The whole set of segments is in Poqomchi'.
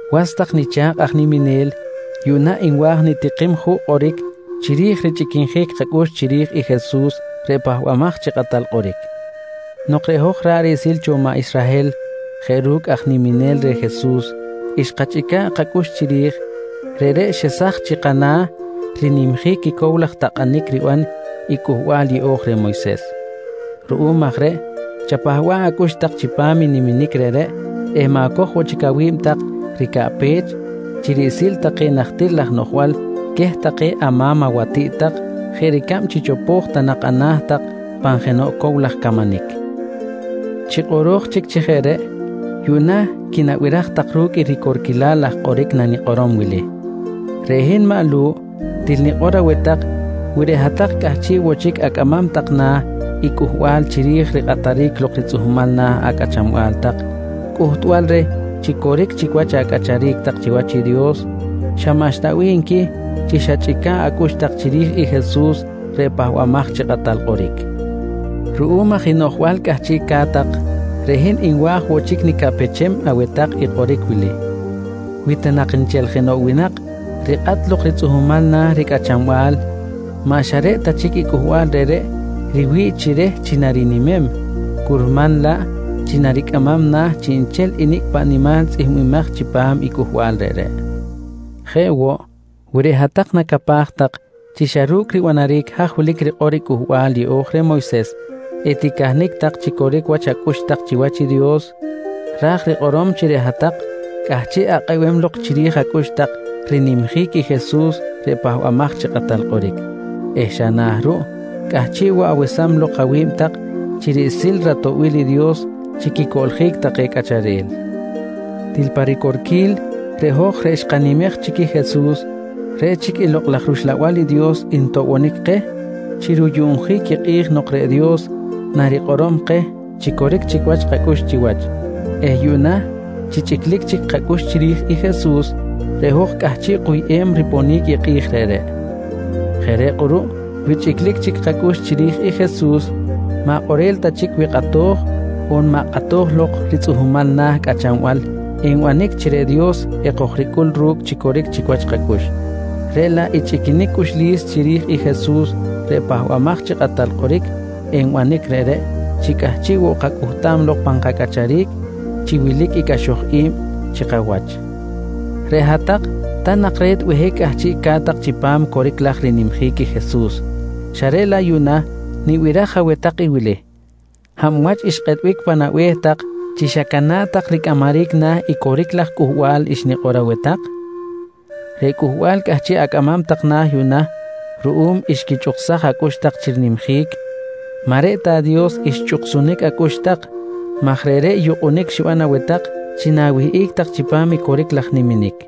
Was tak nicha̱kꞌ aj niminel, yuꞌna nwa̱j nitikim juꞌ kꞌoric chiri̱j richꞌiquinjic kacꞌux tak chiri̱j i Jesus reꞌ Pahbamaj chi Kꞌatal Kꞌoric. Nok reꞌ hoj ra̱ꞌ riꞌsil cho maꞌ Israhel jeꞌ ru̱cꞌ aj niminel reh Jesus xkachꞌica̱ꞌ kacꞌux chiri̱j, reꞌreꞌ xesaj chi kana̱ rinimjic i cow laj takꞌanic riban i Cꞌuhbal Yeꞌo̱j reh Moyses. Ruꞌum aj reꞌ chapahba̱ꞌ acꞌux tak chipam i niminic reꞌreꞌ eh ma̱coj woꞌ chic awi̱b tak ricaꞌpech chi riꞌsil take najtir laj noꞌjbal queh take ama̱m awatiꞌt tak jeꞌ ricab chi chopo̱j ta nak ana̱ tak pan jenoꞌ cow laj camanic. Chi kꞌoro̱j chic chi jeꞌ reꞌ, yuꞌna quinabiraj tak ru̱cꞌ i ricorquilal laj kꞌoric nanikꞌorom wili: Reꞌ hin maꞌ Lu̱ꞌ til nikꞌor aweh tak wi reꞌ hat-tak cꞌahchiꞌ woꞌ chic acꞌamam tak na̱ i cꞌuhbal chiri̱j rikꞌataric lok ritzꞌuhmal na̱ acꞌachanbal tak cꞌuhtbal reh chi coric chic wach acꞌacharic tak chiwach i Dios, xa maꞌxta bih nqui chi xachꞌica̱ꞌ acꞌux tak chiri̱j i Jesus reꞌ Pahbamaj chi Kꞌatal Kꞌoric. Ruꞌum aj i noꞌjbal cꞌahchiꞌca̱t tak, reꞌ hin nwa̱j woꞌ chic nicaꞌpechem aweh tak i kꞌoric wili: Wi ta nak nchel jenoꞌ winak rikꞌat lok ritzꞌuhmal na̱ ricꞌachanbal, maꞌ xa reꞌ ta chic i cꞌuhbal reꞌreꞌ riwi̱ꞌ chi reh chi narinimem, curman laꞌ chi naricꞌamam na̱ chiꞌnchel i nicꞌ paꞌ nimal tzꞌihmbimaj chipam i cꞌuhbal reꞌreꞌ. Jeꞌ woꞌ, wi reꞌ hat-tak nacapaj tak chi xa ru̱cꞌ ribanaric haj wilic rikꞌor i Cꞌuhbal Yeꞌo̱j reh Moyses eticahnic tak chi coric wach acꞌux tak chiwach i Dios, ra̱j rikꞌorom chi reꞌ hat-tak cꞌahchiꞌ akꞌebem lok chiri̱j acꞌux tak rinimjic i Jesus reꞌ Pahbamaj chi Kꞌatal Kꞌoric eh xa na̱ ruꞌ cꞌahchiꞌ woꞌ awesam lok awi̱b tak chi riꞌsil ratoꞌbil i Dios chi quicoꞌljic take cꞌacharel. Til pa ricorquil reꞌ hoj reꞌ xkanimej chic i Jesus, reꞌ chic i Lokꞌ laj rUxlabal i Dios ntoꞌbonic keh chi ruyuꞌnjic i kꞌi̱j nok reꞌ Dios narikꞌorom keh chi coric chic wach kacꞌux chiwach eh yuꞌna chi chꞌiclic chic kacꞌux chiri̱j i Jesus, reꞌ hoj cꞌahchiꞌ kuyꞌem riponic i kꞌi̱j reꞌreꞌ. Jeꞌ reꞌ kꞌuruꞌ wi chꞌiclic chic kacꞌux chiri̱j i Jesus maꞌ kꞌorel ta chic wi kꞌato̱j on maꞌ kꞌato̱j lok ritzꞌuhmal na̱ cꞌachanbal enbanic chi reꞌ Dios ekojricꞌul ru̱cꞌ chi coric chic wach kacꞌux, reꞌ laꞌ i chꞌiquinic cꞌuxlis chiri̱j i Jesus reꞌ Pahbamaj chi Kꞌatal Kꞌoric nbanic reꞌreꞌ chi cꞌahchiꞌ woꞌ kacꞌuhtam lok pan kacꞌacharic chi wilic i cꞌaxoj i̱b chi kawach. Reꞌ hat-tak, ta nak re̱t behic cꞌahchiꞌca̱t tak chipam coric laj rinimjic i Jesus xa reꞌ laꞌ yuꞌna, nibiraj aweh tak i wili: Hab wach xkꞌetbic pan abe̱h tak chi xacana̱ꞌ tak ricꞌamaric na̱ i coric laj cꞌuhbal xnikꞌor aweh tak? Reꞌ cꞌuhbal cꞌahchiꞌ acꞌamam tak na̱ yuꞌna ruꞌum xquichꞌuksaj acꞌux tak chi rinimjic, maꞌ reꞌ ta Dios xchꞌuksunic acꞌux tak maj reꞌreꞌ yukꞌunic xiban aweh tak chi na̱wihꞌic tak chipam i coric laj niminic.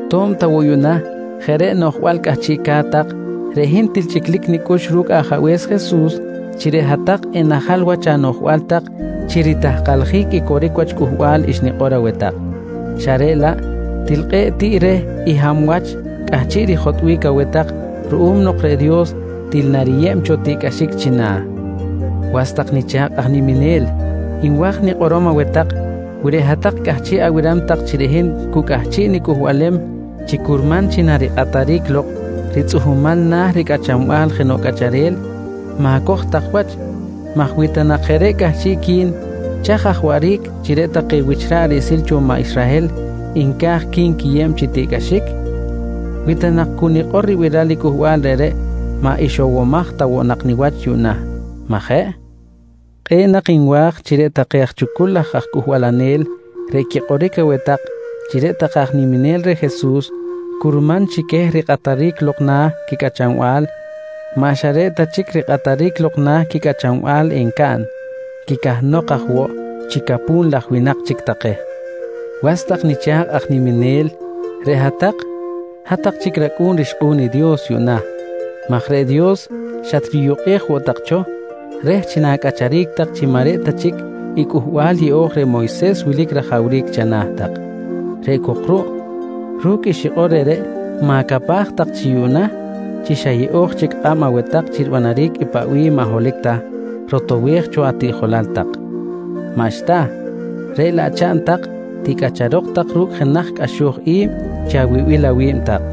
Tob ta woꞌ yuꞌna jeꞌ reꞌ noꞌjbal cꞌahchiꞌca̱t tak, reꞌ hin til chꞌiclic nicꞌux ru̱cꞌ Ajabe̱s Jesus chi reꞌ hat-tak enajal wach anoꞌjbal tak chi ritahkaljic i coric wach cꞌuhbal xnikꞌor aweh tak, xa reꞌ laꞌ til kꞌe̱ꞌ tiꞌ reh i xa hab wach cꞌahchiꞌ rijotꞌbic aweh tak ruꞌum nok reꞌ Dios til nariyeb cho tiꞌcꞌaxic china̱. Was tak nicha̱kꞌ aj niminel, nwa̱j nikꞌorom aweh tak wi reꞌ hat-tak cꞌahchiꞌ abiram tak chi reꞌ hin cu cꞌahchiꞌ nicꞌuhbalem chi curman chi narikꞌataric lok ritzꞌuhmal na̱ ricꞌachanbal jenoꞌ cꞌacharel, ma̱coj tak wach maj wi ta nak jeꞌ reꞌ cꞌahchiꞌqui̱n chaj aj waꞌric chi reꞌ take wich ra̱ꞌ riꞌsil cho maꞌ Israhel nca̱j qui̱nquiyeb chi tiꞌcꞌaxic? Wi ta nak cu nikꞌor ribiral i cꞌuhbal reꞌreꞌ, maꞌ ixowomaj ta woꞌ nak niwach yuꞌna, maꞌ jeꞌ? Kꞌe̱ꞌ nak nwa̱j chi reꞌ take aj chucul laj aj cꞌuhbalanel reꞌ quikꞌoric aweh tak chi reꞌ take aj niminel reh Jesus curman chi queh rikꞌataric lok na̱ quicꞌachanbal maꞌ xa reꞌ ta chic rikꞌataric lok na̱ quicꞌachanbal encaꞌn, quicahnok aj woꞌ chi capu̱n laj winak chic take! Was tak nicha̱kꞌ aj niminel reꞌ hat-tak, hat-tak chic racꞌu̱n rixkꞌu̱n i Dios yuꞌna maj reꞌ Dios xatriyukꞌej woꞌ tak cho reh chi na̱cꞌacharic tak chi maꞌ reꞌ ta chic i Cꞌuhbal Yeꞌo̱j reh Moyses wilic rajawric chana̱ tak. Reꞌ cok ruꞌ, ru̱cꞌ i xikꞌor reꞌreꞌ ma̱capaj tak chi yuꞌna chi xa yeꞌo̱j chic kꞌab aweh tak chi ribanaric i paꞌ bih maꞌ holohic ta rotowej cho atiꞌjolal tak. Maꞌxta, reꞌ laꞌ chaꞌn tak ticꞌacharok tak ru̱cꞌ jenaj cꞌaxoj i̱b chi awibil awi̱b tak.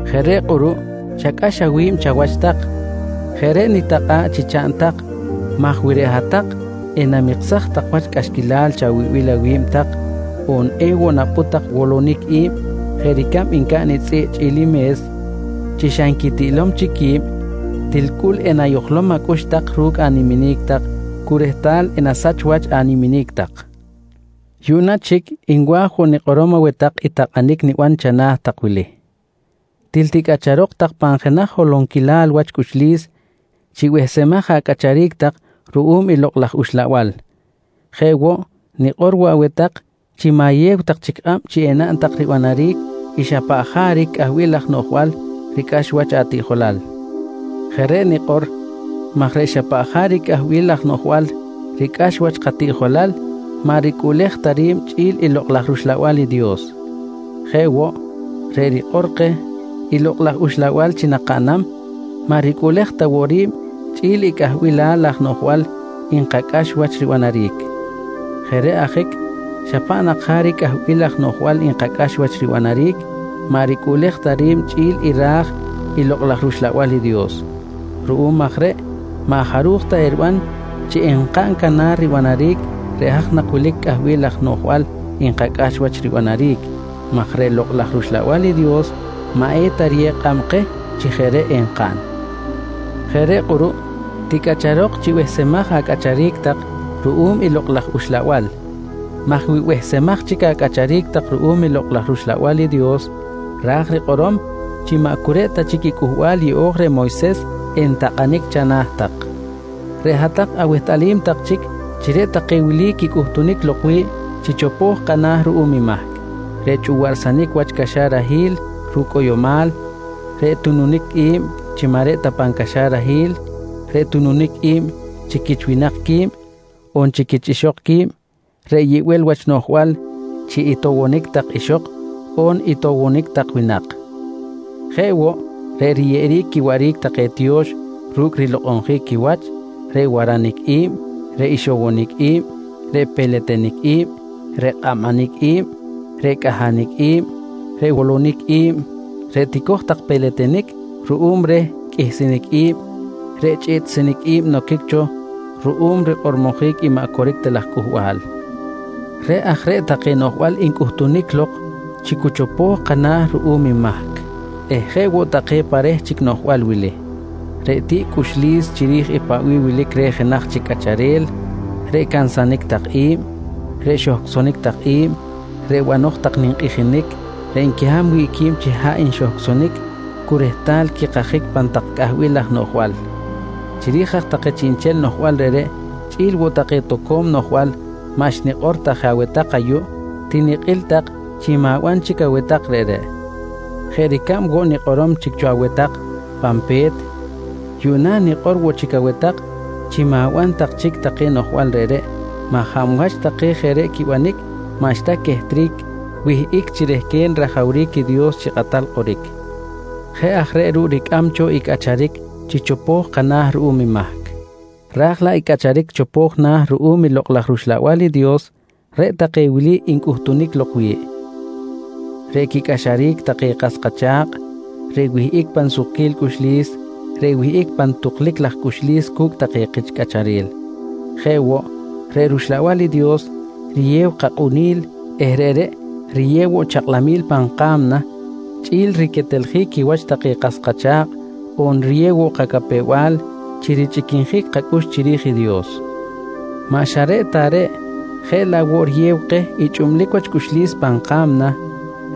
Jeꞌ reꞌ kꞌuruꞌ chacꞌax awi̱b chawach tak. Jeꞌ reꞌ nitakꞌa̱ꞌ chi chaꞌn tak maj wi reꞌ hat-tak enamiksaj tak wach cꞌaxquilal chawibil awi̱b tak on ewoꞌ napꞌut tak wolonic i̱b jeꞌ ricab ncaꞌn i tzꞌiꞌ chꞌi̱l i me̱s chi xa nquitiꞌlom chic qui̱b, til cꞌul enayojlom acꞌux tak ru̱cꞌ animinic tak cu rehtal enasach wach animinic tak. Yuꞌna chic, nwa̱j woꞌ nikꞌorom aweh tak i takꞌanic niban chana̱ tak wili: Til ticꞌacharok tak pan jenaj holonquilal wach cꞌuxlis chi behsemaj acꞌacharic tak ruꞌum i Lokꞌ laj Uxlabal. Jeꞌ woꞌ, nikꞌor woꞌ aweh tak chi ma̱yew tak chic kꞌab chi enaꞌn tak ribanaric i xa paꞌ jaric cꞌahbil laj noꞌjbal ricꞌax wach atiꞌjolal. Jeꞌ reꞌ nikꞌor maj reꞌ xa paꞌ jaric cꞌahbil laj noꞌjbal ricꞌax wach katiꞌjolal maꞌ ricꞌuꞌlej ta ri̱b chꞌi̱l i Lokꞌ laj rUxlabal i Dios. Jeꞌ woꞌ, reꞌ rikꞌor keh i Lokꞌ laj Uxlabal chi nakaꞌnam, maꞌ ricꞌuꞌlej ta woꞌ ri̱b chꞌi̱l i cꞌahbilal laj noꞌjbal nkacꞌax wach ribanaric. Jeꞌ reꞌ ajic paꞌ nak jaric cꞌahbilal laj noꞌjbal nkacꞌax wach ribanaric maꞌ ricꞌuꞌlej ta ri̱b chꞌi̱l i ra̱j i Lokꞌ laj rUxlabal i Dios. Ruꞌum aj reꞌ maꞌ jaruj ta eriban chi enkaꞌn canar ribanaric reꞌ haj nak wilic cꞌahbilal laj noꞌjbal nkacꞌax wach ribanaric maj reꞌ Lokꞌ laj rUxlabal i Dios maꞌ eta riyew kꞌab keh chi jeꞌ reꞌ enkaꞌn. Jeꞌ reꞌ kꞌuruꞌ ticꞌacharok chi behsemaj acꞌacharic tak ruꞌum i Lokꞌ laj Uxlabal maj wi behsemaj chic acꞌacharic tak ruꞌum i Lokꞌ laj rUxlabal i Dios ra̱j rikꞌorom chi maꞌ cu reꞌ ta chic i Cꞌuhbal Yeꞌo̱j reh Moyses entakꞌanic chana̱ tak. Reꞌ hat-tak awehtꞌalim tak chic chi reꞌ take wili quicꞌuhtunic lok wi̱ꞌ chi chopo̱j kana̱ ruꞌum i mahc: Reꞌ chꞌuwaꞌrsanic wach caxarahil ru̱cꞌ cꞌoyomal, reꞌ tununic i̱b chi maꞌ reꞌ ta pan caxarahil, reꞌ tununic i̱b chi quich winak qui̱b, on chi quich ixok qui̱b, reꞌ yibel wach noꞌjbal chi itowonic tak ixok on itowonic tak winak. Jeꞌ woꞌ, reꞌ riyeꞌeric quiwaꞌric take tiyo̱x ru̱cꞌ rilokꞌonjic quiwach, reꞌ waranic i̱b, reꞌ ixowonic i̱b, reꞌ peletenic i̱b, reꞌ kꞌabanic i̱b, reꞌ cꞌahanic i̱b, reꞌ wolonic i̱b, reꞌ tico̱j tak peletenic ruꞌum reh qꞌuihsinic i̱b, reꞌ chꞌiꞌtsinic i̱b noquic cho ruꞌum rikꞌormojic i maꞌ coric ta laj cꞌuhbal. Jeꞌ aj reꞌ take noꞌjbal ncꞌuhtunic lok chi cu chopo̱j kana̱ ruꞌum i mahc eh jeꞌ woꞌ take pa reh chic noꞌjbal wili: Reꞌ tiꞌquil cꞌuxlis chiri̱j paꞌ bih wilic reh jenaj chic cꞌacharel, reꞌ cansanic tak i̱b, reꞌ xohcꞌsonic tak i̱b, reꞌ banoj tak ninkꞌijinic reꞌ nquiham wi̱ꞌ qui̱b chi haꞌ nxohcꞌsonic cu rehtal quikajic pan tak cꞌahbilal laj noꞌjbal. Chiri̱j aj take chiꞌnchel noꞌjbal reꞌreꞌ chꞌi̱l woꞌ take toco̱m noꞌjbal maꞌ xnikꞌor ta je aweh tak ayuꞌ, tinikꞌil tak chi ma̱ban chic aweh tak reꞌreꞌ. Jeꞌ ricab woꞌ nikꞌorom chic cho aweh tak pan pe̱t yuꞌ na̱ nikꞌor woꞌ chic aweh tak chi ma̱ban tak chic take noꞌjbal reꞌreꞌ maj hab wach take jeꞌ reꞌ quibanic maꞌxta quehtric wihꞌic chi rehquen rajawric i Dios chi kꞌatal kꞌoric. Jeꞌ aj reꞌ ruꞌ ricꞌam cho i cꞌacharic chi chopo̱j kana̱ ruꞌum i mahc, raj laꞌ i cꞌacharic chopo̱j na̱ ruꞌum i Lokꞌ laj rUxlabal i Dios reꞌ take wili ncꞌuhtunic lok wi̱ꞌ: Reꞌ quicꞌaxaric take kas kacha̱kꞌ, reꞌ wihꞌic pan sukquil cꞌuxlis, reꞌ wihꞌic pan tuklic laj cꞌuxlis cu̱cꞌ take kich cꞌacharel. Jeꞌ woꞌ, reꞌ Lokꞌ laj rUxlabal i Dios riyew kakꞌunil eh reꞌreꞌ riyew woꞌ chakꞌlamil pan ka̱mna chꞌi̱l riqueteljic quiwach take kas kacha̱kꞌ, on riyew woꞌ kacapew-bal chi richꞌiquinjic kacꞌux chiri̱j i Dios. Maꞌ xa reꞌ ta reꞌ jeꞌ laꞌ woꞌ riyew keh i chꞌublic wach cꞌuxlis pan ka̱mna,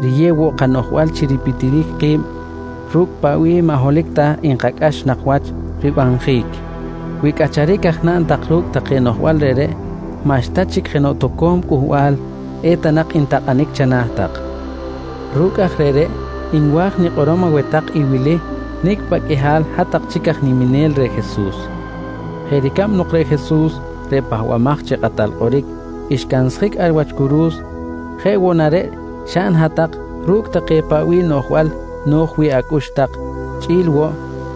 riyew woꞌ kanoꞌjbal chi ripitjic ki̱b ru̱cꞌ paꞌ bih maꞌ holohic ta nkacꞌax nak wach ribanjic. Wi cꞌacharic aj naꞌn tak ru̱cꞌ take noꞌjbal reꞌreꞌ, maꞌxta chic jenoꞌ toco̱m cꞌuhbal eta nak ntakꞌanic chana̱ tak. Ru̱cꞌ aj reꞌreꞌ nwa̱j nikꞌorom aweh tak i wili nicꞌ paꞌ qꞌuihal hat-tak chic aj niminel reh Jesus: Jeꞌ ricab nok reꞌ Jesus reꞌ Pahbamaj chi Kꞌatal Kꞌoric xcansjic ar wach curu̱s, jeꞌ woꞌ na reꞌ xaꞌn hat-tak ru̱cꞌ take paꞌ bih noꞌjbal no̱j wi̱ꞌ acꞌux tak chꞌi̱l woꞌ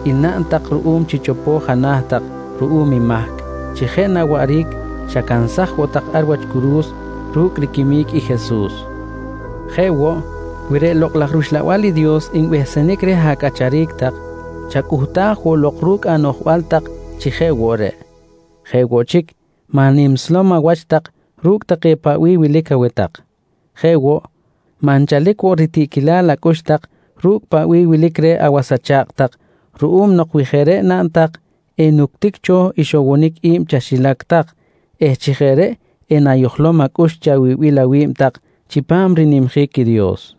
i naꞌn tak ruꞌum chi chopo̱j ana̱ tak ruꞌum i mahc chi jeꞌ na waꞌric xacansaj woꞌ tak wach ar wach curu̱s ru̱cꞌ riquimic i Jesus. Jeꞌ woꞌ, wi reꞌ Lokꞌ laj rUxlabal i Dios nbehsenic reh acꞌacharic tak, chacꞌuhtaj woꞌ lok ru̱cꞌ anoꞌjbal tak chi jeꞌ woꞌ reꞌ. Jeꞌ woꞌ chic, maꞌ animslom awach tak ru̱cꞌ take paꞌ bih wilic aweh tak. Jeꞌ woꞌ, maꞌ nchalic woꞌ ritiꞌquilal acꞌux tak ru̱cꞌ paꞌ bih i wilic reh awas acha̱kꞌ tak ruꞌum nok wi jeꞌ reꞌ naꞌn tak enuctic cho ixowonic i̱b chaxilac tak eh chi jeꞌ reꞌ enayojlom acꞌux chi awibil awi̱b tak chipam rinimjic i Dios.